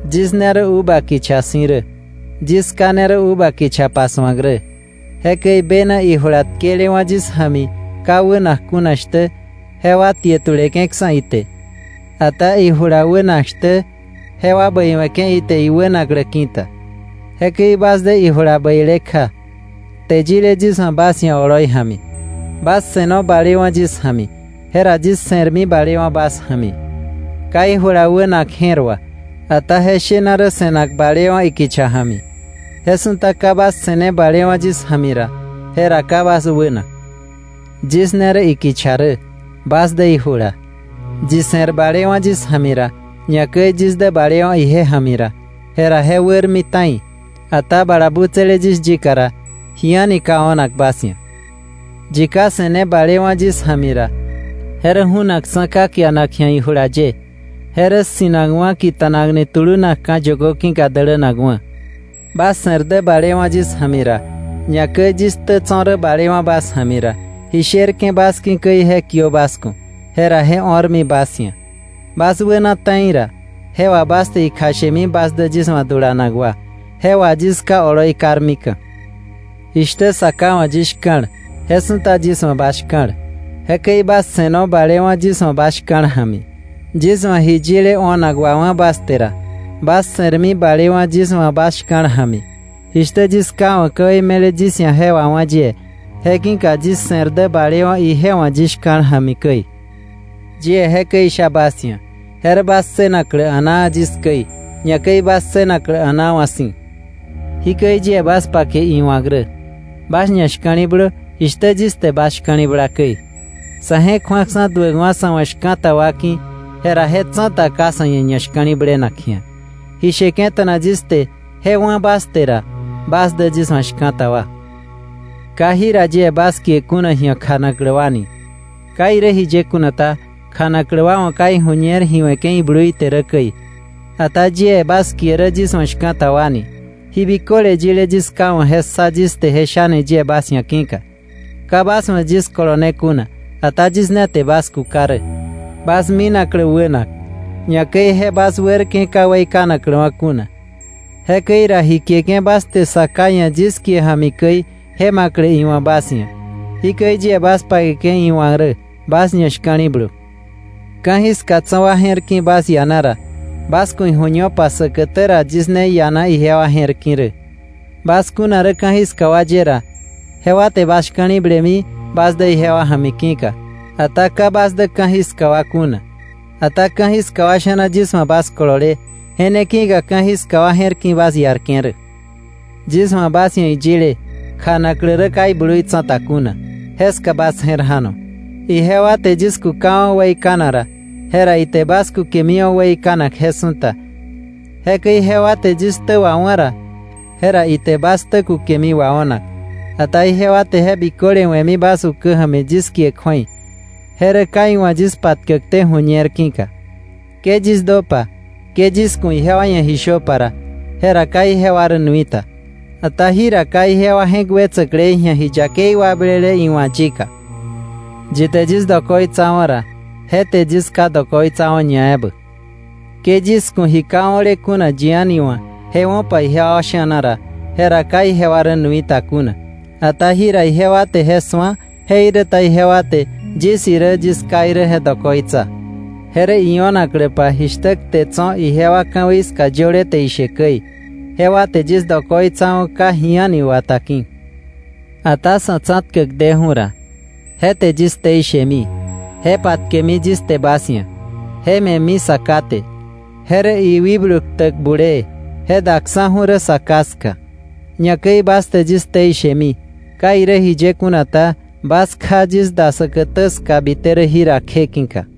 “Yis ne rä uva kicha si̱ rä. Yis Ká ne rä uva kicha pasu̱ak rä. Jekäi bena ijula tkelewa̱ yis ja̱mi ka wänak kuna shtä, jewa tie tuleke̱ksa̱ ite. Ata ijula wänak shtä, jewa bäi we̱ke̱ ite iwänaklä ki̱ta. Jekäi bas dä ijula bäile kja, kte yile yis wa̱ bas ia̱ oloi ja̱mi. Bas se̱no balewa̱ yis ja̱mi, jera yis se̱rmi balewa̱ bas ja̱mi. Ka ijula wänak je̱r wà, ata je shena rä se̱nak balewa̱ ikicha ja̱mi. Je su̱ta ka bas se̱ne balewa̱ yis ja̱mi ra, jera ka bas wänak. “Yis ne rä ikicha rä, bas dä ijula. Yi se̱r balewa̱ yis ja̱mi ra, ñakäi yis dä balewa̱ ije ja̱mi ra, jera je wärmi ta̱i. Ata bala butsäle yis yika ra, ji a̱ni ka o̱nak bas ia̱. Yi ka se̱ne balewa̱ yis ja̱mi ra, je rä ju̱nakksa̱ ka kianak ji̱a ijula ye. Je rä ssi̱nakwa̱ kita̱nakni tulunakka̱ yökö ki̱ka dälänakwa̱. “Bas se̱r dä balewa̱ yis ja̱mi ra, ñakäi yis ktä tso̱ rä balewa̱ bas ja̱mi ra, ji sherke̱ bas ki̱ käi je kiö bas ku̱, jera je o̱rmi bas ia̱. Bas wäna ta̱i ra, je wà bas te ikjashemi bas dä yis wa̱ dulanak wa. Je wà yis Ká oloi karmika̱. Jishtä Sa Ká wa̱ yis shka̱l, je su̱ta yis wa̱ bas shka̱l. Jekäi bas se̱no balewa̱ yis wa̱ bas shka̱l ja̱mi. Yis wa̱ ji yile o̱nak wawá̱ bas te ra, bas se̱rmi balewa̱ yis wa̱ bas shka̱l ja̱mi, jishtä yis Ká wa̱ ka̱wei me̱le yis ia̱ je wawá̱ yie, je ki̱ka yis se̱r dä balewa̱ ije wa̱ yis shka̱l ja̱mi käi. “Yie jekäi isha bas ia̱ je rä bas ssënaklä a̱naa, yis käi, ñakäi bas ssënaklä a̱naa wa̱ si̱. Jikäi yie bas pake iwa̱k rä: Bas ñashka̱li̱blö, jishtä yis te bas shka̱li̱bla käi. Sa̱ je̱k ju̱aksa̱ duäkwa̱ sa̱ wa̱ shka̱ta wa ki̱, jera je tsa̱ta ka sa̱ ia̱ ñashka̱li̱blenak ji̱a. Ji sheke̱ta̱na yis te je wá̱ bas te ra, bas dä yis wa̱ shka̱ta wa. Ka jira yie bas kie kuna ji̱a kjanaklä wa ni. Ka irä jiye kuna ta, kjanaklä wa wa̱ ka iju̱ñer ji we̱ke̱ iblui te rä käi. Ata yie bas kie rä yis wa̱ shka̱ta wa ni, ji biköle yile yis ká wa̱ je ssa yis te, je shani yie bas ia̱ je ki̱ka. Ka bas wa̱ yis kolone kuna, ata yis ne te bas kuka rä, bas minaklä wänak; ñakäi je bas wärke̱ ka weikanakläwa̱ kuna. Jekäi ra ji kieke̱ bas te Sa Ká ia̱ yis kie ja̱mi käi, je ma̱klä iwa̱ bas ia̱. Jikäi yie bas pakeke̱ iwa̱k rä: Bas ñashka̱li̱blö. “Ka̱jiska tso̱ wa je̱r ki̱ bas iana ra, bas ku̱ iju̱ñopa säkätä ra yis ne iana ijewa je̱r ki̱ rä. Bas kuna rä ka̱jiska wa ye ra, jewa te bas shka̱li̱blemi bas dä ijewa ja̱mi ki̱ka. Ata ka bas dä ka̱jiska wa kuna, ata ka̱jiska wa sha̱na yis wa̱ bas kolole, je ne ki̱ka ka̱jiska wa je̱r ki̱ bas iarke̱ rä. Yis wa̱ bas ia̱ iyile: ‘Kjanaklä rä ka iblui tsa̱ta kuna’, jeska bas je̱r ja̱no. Ijewa te yis kukawa̱ weikanak ra, jera ite bas kukemiwa̱ weikanak je su̱ta. Jekäi jewa te yis ktä wawá̱ ra, jera ite bas ktä kukemi wao̱nak. Ata ijewa te je biköle we̱mi bas ukä ja̱mi yis kie kju̱ei. Je rä ka iwa̱ yis patkäkté ju̱ñer ki̱ka. “Ke yis döpa, ke yis ku̱ ijewa ia̱ ji shöpa ra, jera ka ijewa rä nui ta. Ata jira ka ijewa je̱k wetsäklei ji̱a ji yakei wakblele iwa̱ yika. Yi te yis dokoitsawa̱ ra, je te yis Ká dokoitsawa̱ ñaebä. Ke yis ku̱ ji ka o̱le kuna yi a̱ni wa̱ je wo̱pa ijewa sha̱na ra, jera ka ijewa rä nui ta kuna. Ata jira ijewa te je su̱a, jeiräta jewa te yis irä yis Ká irä je dokoitsa. Je rä io̱nakläpa jishtä kte tso̱ ijewa ka̱wei ska yöle te ishe käi: ‘Jewa te yis dokoitsawa̱ ka ji a̱ni wata ki̱.’ “Ata Sa̱ Tsa̱tkäk deju̱ ra, je te yis ktei shemi. Je patkemi yis te bas ia̱. Je me̱mi Sa Ká te. Je rä iwikblu ktäk bulee, je daksa̱ju̱ rä Sa Ká ska. Ñakäi bas te yis ktei shemi. Ka irä jiye kuna ta, bas kja yis da säkätä ska bite rä jira kje ki̱ka.